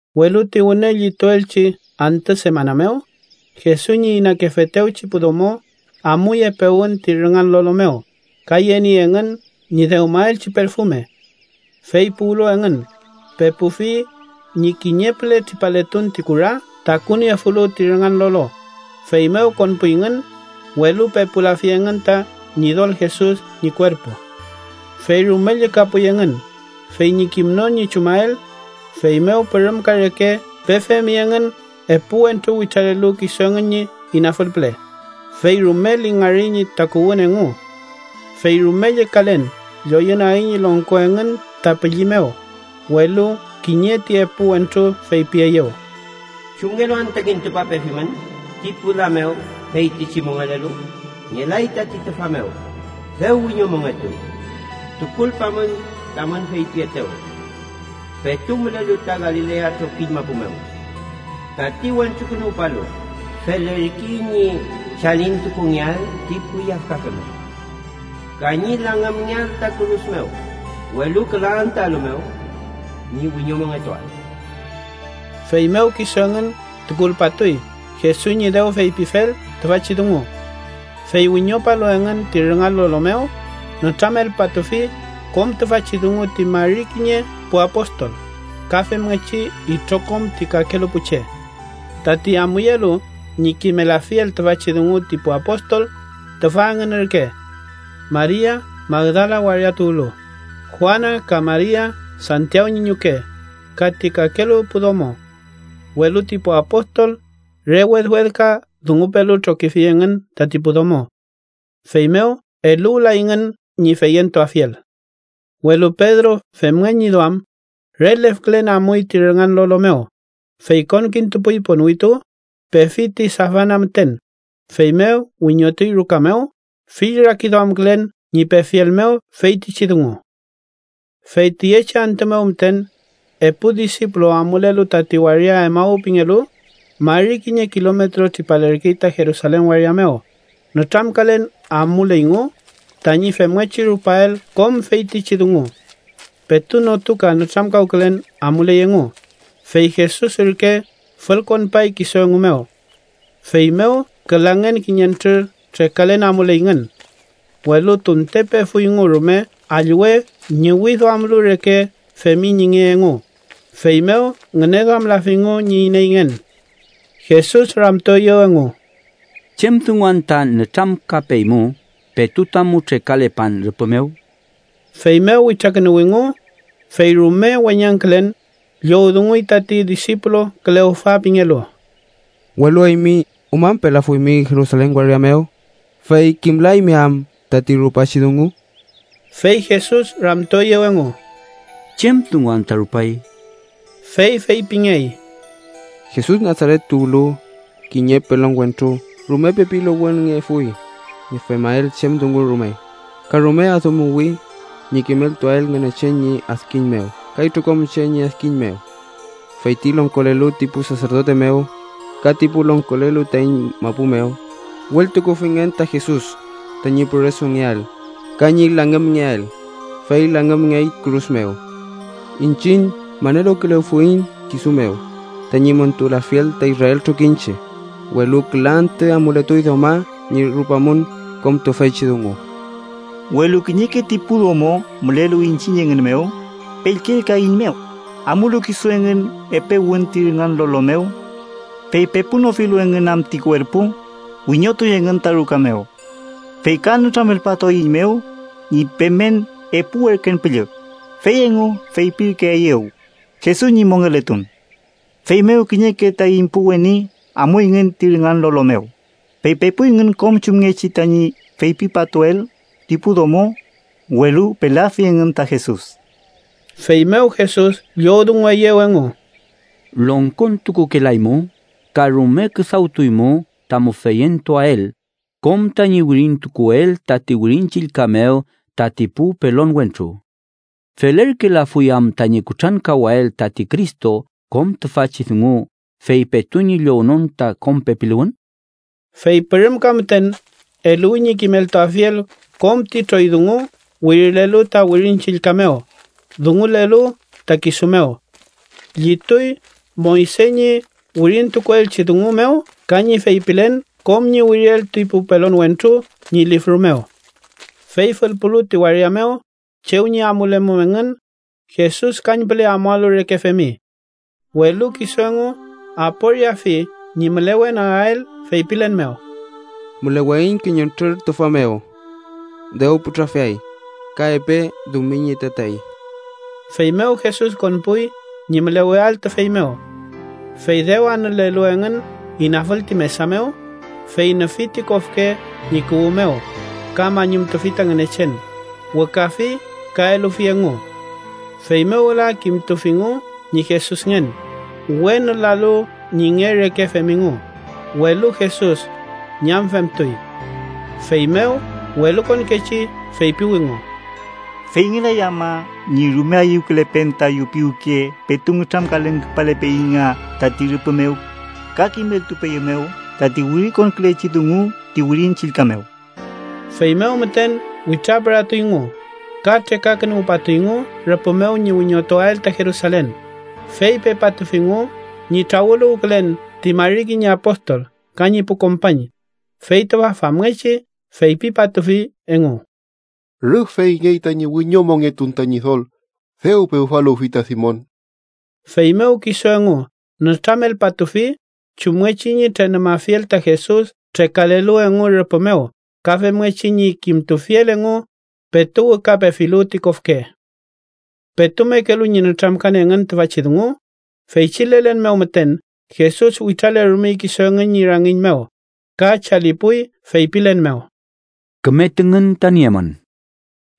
Welu ti wüne llituelchi antü semana mew, Jesus ñi inakefetewchi pu domo amuy epe wün ti rüngan lolo mew ka yeniey engün ñi dewmaelchi perfume. Fey puwlu engün, pepufi ñi kiñe püle tripaletun ti kura takuniefulu ti rüngan lolo, feymew konpuyngün, welu pepulafi engün ta Ñidol Jesus ñi kuerpu. Fey rume llükapuy engün fey ñi kimnon ñi chumael, feymew pürümka reke pefemi engün epu wentru witralelu kisu engün ñi inafül püle, fey rume lingari ñi takuwün engu. Fey rume llükalen lloyünagi ñi longko engün ta pülli mew, welu kiñe ti epu wentru feypieyew: —¿Chumngelu anta kintupapefimün ti pu la mew feytichi mongelelu? ¡Ngelay tati tüfa mew! ¡Dew wiñomongetuy! Tukulpamün tamün feypietew petu mülelu ta Galilea trokiñ mapu mew: ‘Tati Wentrukünuwpalu felerkey ñi chalintukungeael ti pu yafkafe mew ka ñi langümngeael ta kürus mew, welu küla antüalu mew ñi wiñomongetuael.’ Feymew kisu engün tukulpatuy Jesus ñi dew feypifel tüfachi dungu. Fey wiñopalu engün ti rüngan lolo mew, nütramelpatufi kom tüfachi dungu ti mari kiñe pu apostol, ka femngechi itrokom ti kakelu pu che. Tati amuyelu ñi kimelafiel tüfachi dungu ti pu apostol, tüfa engün ürke: Maria Magdala waria tuwlu, Juana ka Maria, Santiaw ñi ñuke, ka ti kakelu pu domo. Welu ti pu apostol re wedwedka dungupelu trokifi engün tati pu domo. Feymew eluwlayngün ñi feyentuafiel. Welu Pedro femngen ñi duam, re lefkülen amuy ti rüngan lolo mew, fey konkintupuy ponwitu, pefi ti safana müten, feymew wiñotuy ruka mew fill rakiduamkülen ñi pefiel mew feytichi dungu. Fey tüyechi antü mew müten, epu disipulu amulelu tati waria Emaw pingelu, mari kiñe kilometro tripalerkey ta Jerusalen waria mew nütramkalen amuleyngu tañi femngechi rupael kom feytichi dungu. Petu notuka nütramkawkülen amuley engu, fey Jesus ürke fülkonpay kisu engu mew. Feymew külangen kiñentrür trekalen amuleyngün. Welu tunte pefuyngu rume allwe ñüwiduamlu reke femi ñi nge engu, feymew ngüneduamlafingu ñi ineyngen. Jesus ramtueyew engu: —¿Chem dungu anta nütramkapeymu petu tamu trekalepan rüpü mew? Feymew witrakünuwingu, fey rume weñangkülen llowdunguy tati disipulu Kleofa pingelu: —¿Welu eymi umañpelafuymi Jerusalen waria mew, fey kimlaymi am tati rupachi dungu? Fey Jesus ramtueyew engu: —¿Chem dungu anta rupay? Fey feypingey: —Jesus Nasaret tuwlu, kiñe pelon wentru rume pepiluwünngefuy ñi femael chem dungu rume ka rume adümuwi ñi kimeltuael Ngünechen ñi adkiñ mew ka itrokom che ñi adkiñ mew. Feyti longkolelu ti pu saserdote mew ka ti pu longkolelu taiñ mapu mew wültukufingün ta Jesus tañi püresungeael ka ñi langümngeael, fey langümngey kürus mew. Iñchiñ maneluwkülefuiñ kisu mew tañi montulafiel ta Israel trokiñche, welu küla antü amuletuy dewma ñi rupamum kom tüfeychi dungu. Welu kiñeke ti pu domo mülelu iñchiñ engün mew pellkelkaeiñmew, amulu kisu engün epe wün ti rüngan lolo mew. Fey pepunofilu engün am ti kuerpu, wiñotuy engün ta ruka mew. Fey ka nütramelpatueiñmew ñi pemen epu werken püllü, fey engu feypirkeeyew Jesus ñi mongeletun. Feymew kiñeke taiñ pu weni amuyngün ti rüngan lolo mew, fey pepuyngün kom chumngechi tañi feypipatuel ti pu domo, welu pelafi engün ta Jesus. Feymew Jesus llowdungueyew engu: —Longkontukukelaymu ka rume küdawtukuymu tamu feyentuael kom tañi wirintukuel tati Wirin Chillka mew tati pu pelon wentru. ¿Felerkelafuy am tañi kutrankawael tati Cristo kom tüfachi dungu fey petu ñi llownon ta kom pepiluwün? Fey pürümka müten eluwi ñi kimeltuafiel kom ti troy dungu wirilelu ta Wirin Chillka mew dungulelu ta kisu mew. Llituy Moyse ñi wirintukuelchi dungu mew ka ñi feypilen kom ñi wiriel ti pu pelon wentru ñi lifru mew. Fey fülpulu ti waria mew chew ñi amulemum engün, Jesus kañpüle amualu reke femi. Welu kisu engu aporiafi ñi mülewenagael feypilen mew: —Müleweiñ kiñentrür tüfa mew. Dew putrafiay, ka epe dumiñi tatey. Feymew Jesus konpuy ñi müleweael tüfey mew. Fey dew anülelu engün inafül ti mesa mew, fey nüfi ti kofke ñi kuwü mew ka mañumtufi ta Ngünechen, wükafi ka elufi engu. Feymew wüla kimtufingu ñi Jesusngen, we nülalu ñi nge reke femingu, welu Jesus ñamfemtuy. Feymew welukonkechi feypiwingu: —¿Feyngelay ama ñi rume ayüwkülepen tayu piwke petu nütramkalen küpalepeiñ nga tati rüpü mew, ka kimeltupeyumew tati wirikonkülechi dungu ti Wirin Chillka mew? Feymew müten witrapüratuyngu ka trekakünuwpatuyngu rüpü mew ñi wiñotuael ta Jerusalen, fey pepatufingu ñi trawüluwkülen ti mari kiñe apostol ka ñi pu kompañ, fey tüfa famngechi feypipatufi engu: —Rüf feyngey tañi wiñomongetun ta Ñidol. Dew pewfaluwfi ta Simon. Feymew kisu engu nütramelpatufi chumngechi ñi trenumafiel ta Jesus trekalelu engu rüpü mew ka femngechi ñi kimtufiel engu petu wükapefilu ti kofke. Petu mekelu ñi nütramkan engün tüfachi dungu, feychi lelen mew müten Jesus witralerumey kisu engün ñi rangiñ mew ka chalipuy feypilen mew: —Küme tüngün ta niemün.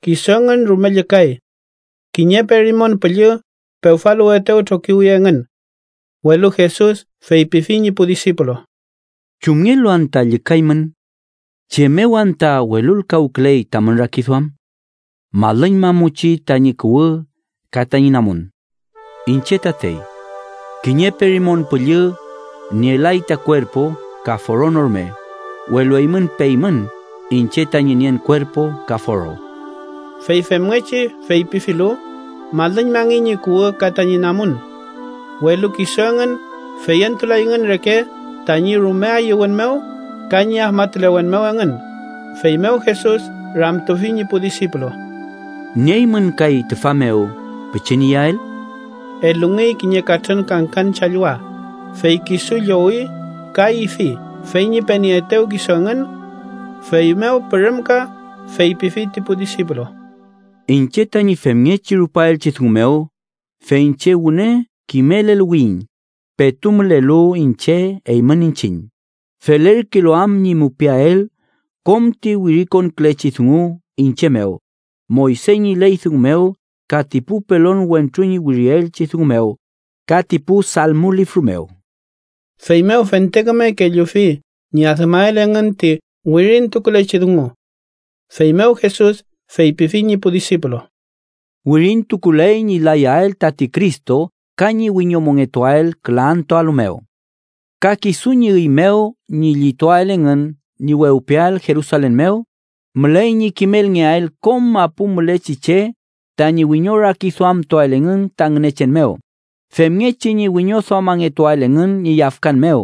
Kisu engün rume llükay. Kiñe perimon püllü pewfaluwetew trokiwi engün. Welu Jesus feypifi ñi pu disipulu: —¿Chumngelu anta llükaymün? ¿Chem mew anta welulkawküley tamün rakiduam? Malüñmamuchi tañi kuwü ka tañi namun. Iñche tatey. Kiñe perimon püllü nielay ta kuerpu ka foro no rume, welu eymün peymün iñche tañi nien kuerpu ka foro. Fey femngechi feypifilu, malüñmangey ñi kuwü ka tañi namun. Welu kisu engün feyentulayngün reke tañi rume ayüwün mew ka ñi afmatulewen mew engün, feymew Jesus ramtufi ñi pu disipulu: —¿Nieymün kay tüfa mew pichin iyael? Elungey kiñe katrün kangkan challwa, fey kisu llowi ka ifi fey ñi penieetew kisu engün. Feymew pürüm ka feypifi ti pu disipulu: —Iñche tañi femngechi rupaelchi dungu mew, fey iñche wüne kimeleluwiyiñ petu mülelu iñche eymün iñchiñ, felerkelu am ñi mupiael kom ti wirikonkülechi dungu iñche mew Moyse ñi ley dungu mew ka ti pu pelon wentru ñi wirielchi dungu mew ka ti pu Salmo lifru mew. Feymew fente küme kellufi ñi adümael engün ti wirintukulechi dungu. Feymew Jesus feypifi ñi pu disipulu: —Wirintukuley ñi layael tati Cristo ka ñi wiñomongetuael küla antüalu mew. Ka kisu ñi üy mew ñi llituael engün ñi wewpiael Jerusalen mew, müley ñi kimelngeael kom mapu mülechi che tañi wiñorakiduamtuael engün ta Ngünechen mew, femngechi ñi wiñoduamangetuael engün ñi yafkan mew.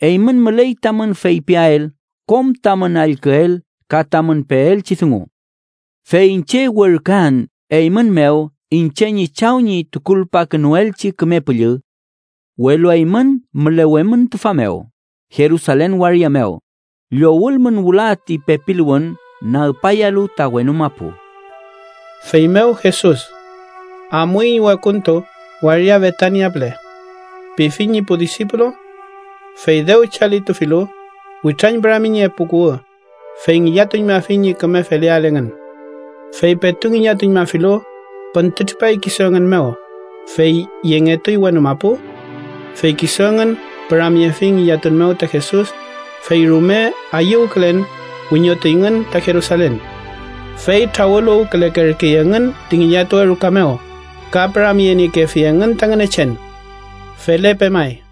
Eymün müley tamün feypiael kom tamün allküel ka tamün peelchi dungu. Fey iñche werküan eymün mew iñche ñi Chaw ñi tukulpakünuelchi Küme Püllü. Welu eymün mülewemün tüfa mew Jerusalen waria mew, llowülmün wüla ti pepiluwün nagpayalu ta wenu mapu. Feymew Jesus “amuiñ wekuntu waria Betania püle” pifi ñi pu disipulu. Fey dew chalitufilu, witrañpürami ñi epu kuwü, fey ngillatuñmafi ñi küme feleael engün. Fey petu ngillatuñmafilu, püntütripay kisu engün mew, fey yengetuy wenu mapu. Fey kisu engün püramyefi ngillatun mew ta Jesus, fey rume ayüwkülen wiñotuyngün ta Jerusalen. Fey trawüluwkülekerkey engün ti ngillatuwe ruka mew ka püramyeniekefi engün ta Ngünechen. Felepe may.